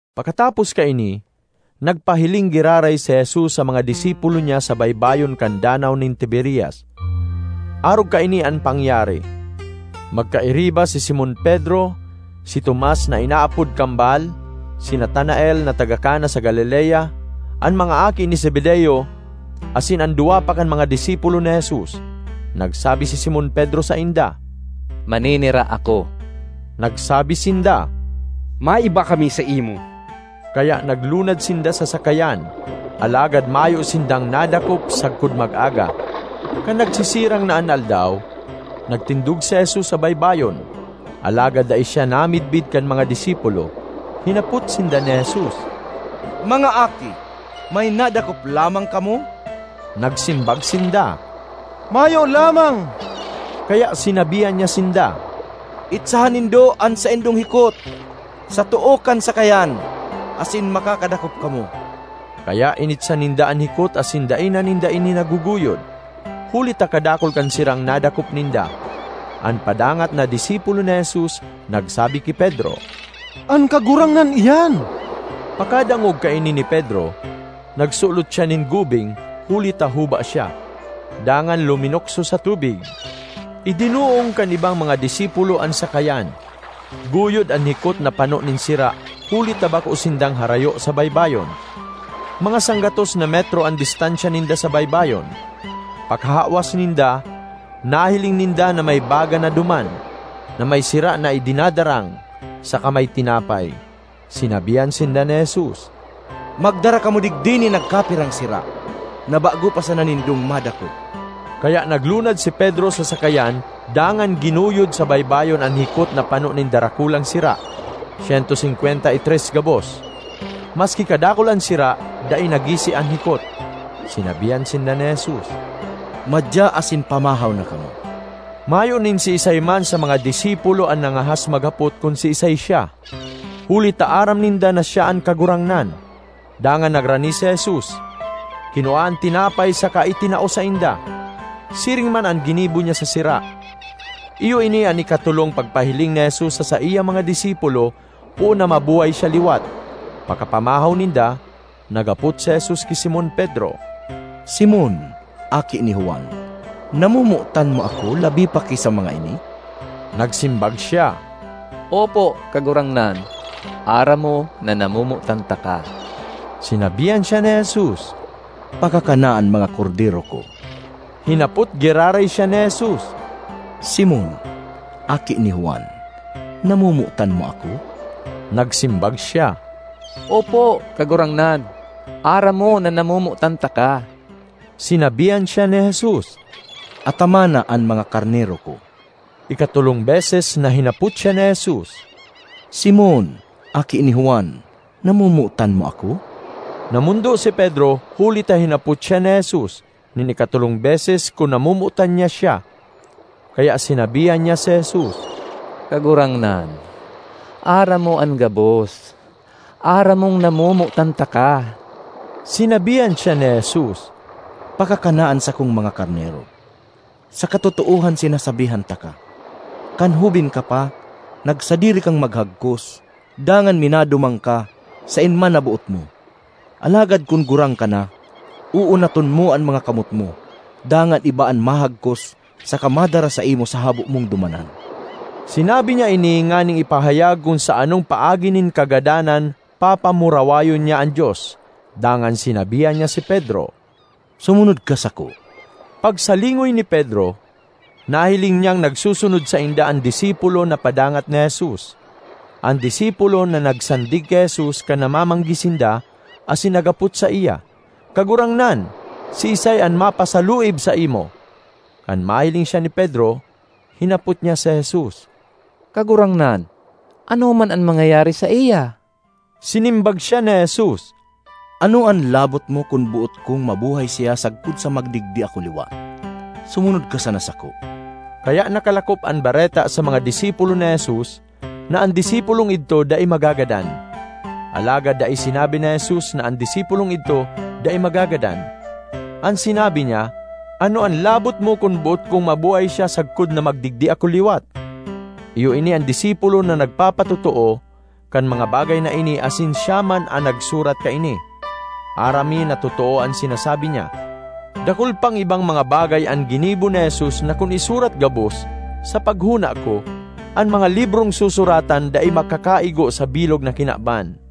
Pakatapos kaini, nagpahiling giraray si Jesus sa mga disipulo niya sa baybayon kan Danaw nin Tiberias. Arog kaini an pangyari: magkairiba si Simon Pedro, si Tomas (na inaapod Kambal), si Natanael (na taga Cana sa Galilea), an mga aki ni Zebedeo, asin an duwa pa kan mga disipulo ni Jesus. Nagsabi si Simon Pedro sainda, “Maninira ako.” Nagsabi sinda, “Maiba kami saimo.” Kaya naglunad sinda sa sakayan, alagad mayo sindang nadakop sagkod mag-aga. Kan nagsisirang na an aldaw, nagtindog si Jesus sa baybayon, alagad dai siya namidbid kan mga disipulo. Hinapot sinda ni Jesus, “Mga aki, may nadakop lamang kamo?” Nagsimbag sinda, “Mayo lamang.” Kaya sinabihan niya sinda, “Itsahan nindo an saindong hikot sa too kan sakayan asin makakadakop kamo.” Kaya initsa ninda an hikot asin dai na ninda ini naguguyod, huli ta kadakul kan sirang nadakop ninda. An padangat na disipulo ni Jesus nagsabi ki Pedro, “An Kagurangnan iyan!” Pagkadangog kaini ni Pedro, nagsulot siya nin gubing (huli ta huba siya) dangan luminukso sa tubig. Idinoong kan ibang mga disipulo an sakayan, guyod an hikot na pano nin sira huli ta bako sindang harayo sa baybayon; mga sanggatos na metro an distansya ninda sa baybayon. Pakahawas ninda, nahiling ninda na may baga na duman, na may sira na idinadarang saka may tinapay. Sinabihan sinda ni Jesus, “Magdara kamo digdi nin nagkapirang sira na bago pa sana nindong madakop.” Kaya naglunad si Pedro sa sakayan dangan ginuyod sa baybayon an hikot na pano nin darakulang sira—syento singkwenta y tres gabos. Maski kadakul an sira, dai nagisi an hikot. Sinabihan sinda ni Jesus, “Madya asin pamahaw na kamo.” Mayo nin siisay man sa mga disipulo na nangahas maghapot kun siisay siya, huli ta aram ninda na siya an Kagurangnan. Dangan nagrani si Jesus, kinua an tinapay saka itinao sainda. Siring man an ginibo niya sa sira. Iyo ini an ikatolong pagpahiling ni Jesus sa saiyang mga disipulo poon na mabuhay siya liwat. Pakapamahaw ninda, naghapot si Jesus ki Simon Pedro, “Simon, aki ni Juan, namomotan mo ako labi pa ki sa mga ini?” Nagsimbag siya, “Opo, Kagurangnan, aram mo na namomotan taka.” Sinabihan siya ni Jesus, “Pakakana an mga kordero ko.” Hinapot giraray siya ni Jesus, “Simon, aki ni Juan, namomotan mo ako?” Nagsimbag siya, “Opo, Kagurangnan, aram mo na namomotan taka.” Sinabihan siya ni Jesus, “Atamana an mga karnero ko.” Ikatolong beses na hinapot siya ni Jesus, “Simon, aki ni Juan, namomotan mo ako?” Namondo si Pedro huli ta hinapot siya ni Jesus nin ikatolong beses kun namomotan niya siya, kaya sinabihan niya si Jesus, “Kagurangnan, aram mo an gabos; aram mong namomotan taka!” Sinabihan siya ni Jesus, “Pakakana an sakong mga karnero. Sa katotoohan sinasabihan taka: kan hoben ka pa, nagsadiri kang maghagkos dangan minaduman ka saen man na boot mo; alagad kun gurang ka na, uunaton mo an mga kamot mo dangan iba an mahagkos saka madara saimo sa habo mong dumanan.” (Sinabi niya ini nganing ipahayag kun sa anong paagi nin kagadanan papamurawayon niya an Dios.) Dangan sinabihan niya si Pedro, “Sumunod ka sako!” Pagsalingoy ni Pedro, nahiling niyang nagsusunod sainda an disipulo na padangat ni Jesus—an disipulo na nagsandig ki Jesus kan namamanggi sinda asin naghapot saiya, “Kagurangnan, siisay an mapasaluib saimo?” Kan mahiling siya ni Pedro, hinapot niya si Jesus, “Kagurangnan, ano man an mangyayari saiya?” Sinimbag siya ni Jesus, “Ano an labot mo kun boot kong mabuhay siya sagkod na magdigdi ako liwat? Sumunod ka sana sako!” Kaya nakalakop an bareta sa mga disipulo ni Jesus na an disipulong idto dai magagadan. Alagad dai sinabi ni Jesus na an disipulong idto dai magagadan; an sinabi niya, “Ano an labot mo kun boot kong mabuhay siya sagkod na magdigdi ako liwat?” Iyo ini an disipulo na nagpapatotoo kan mga bagay na ini asin siya man an nagsurat kaini. Aram mi na totoo an sinasabi niya. Dakul pang ibang mga bagay an ginibo ni Jesus na kun isurat gabos, sa paghona ko, an mga librong susuratan dai makakaigo sa bilog na kinaban.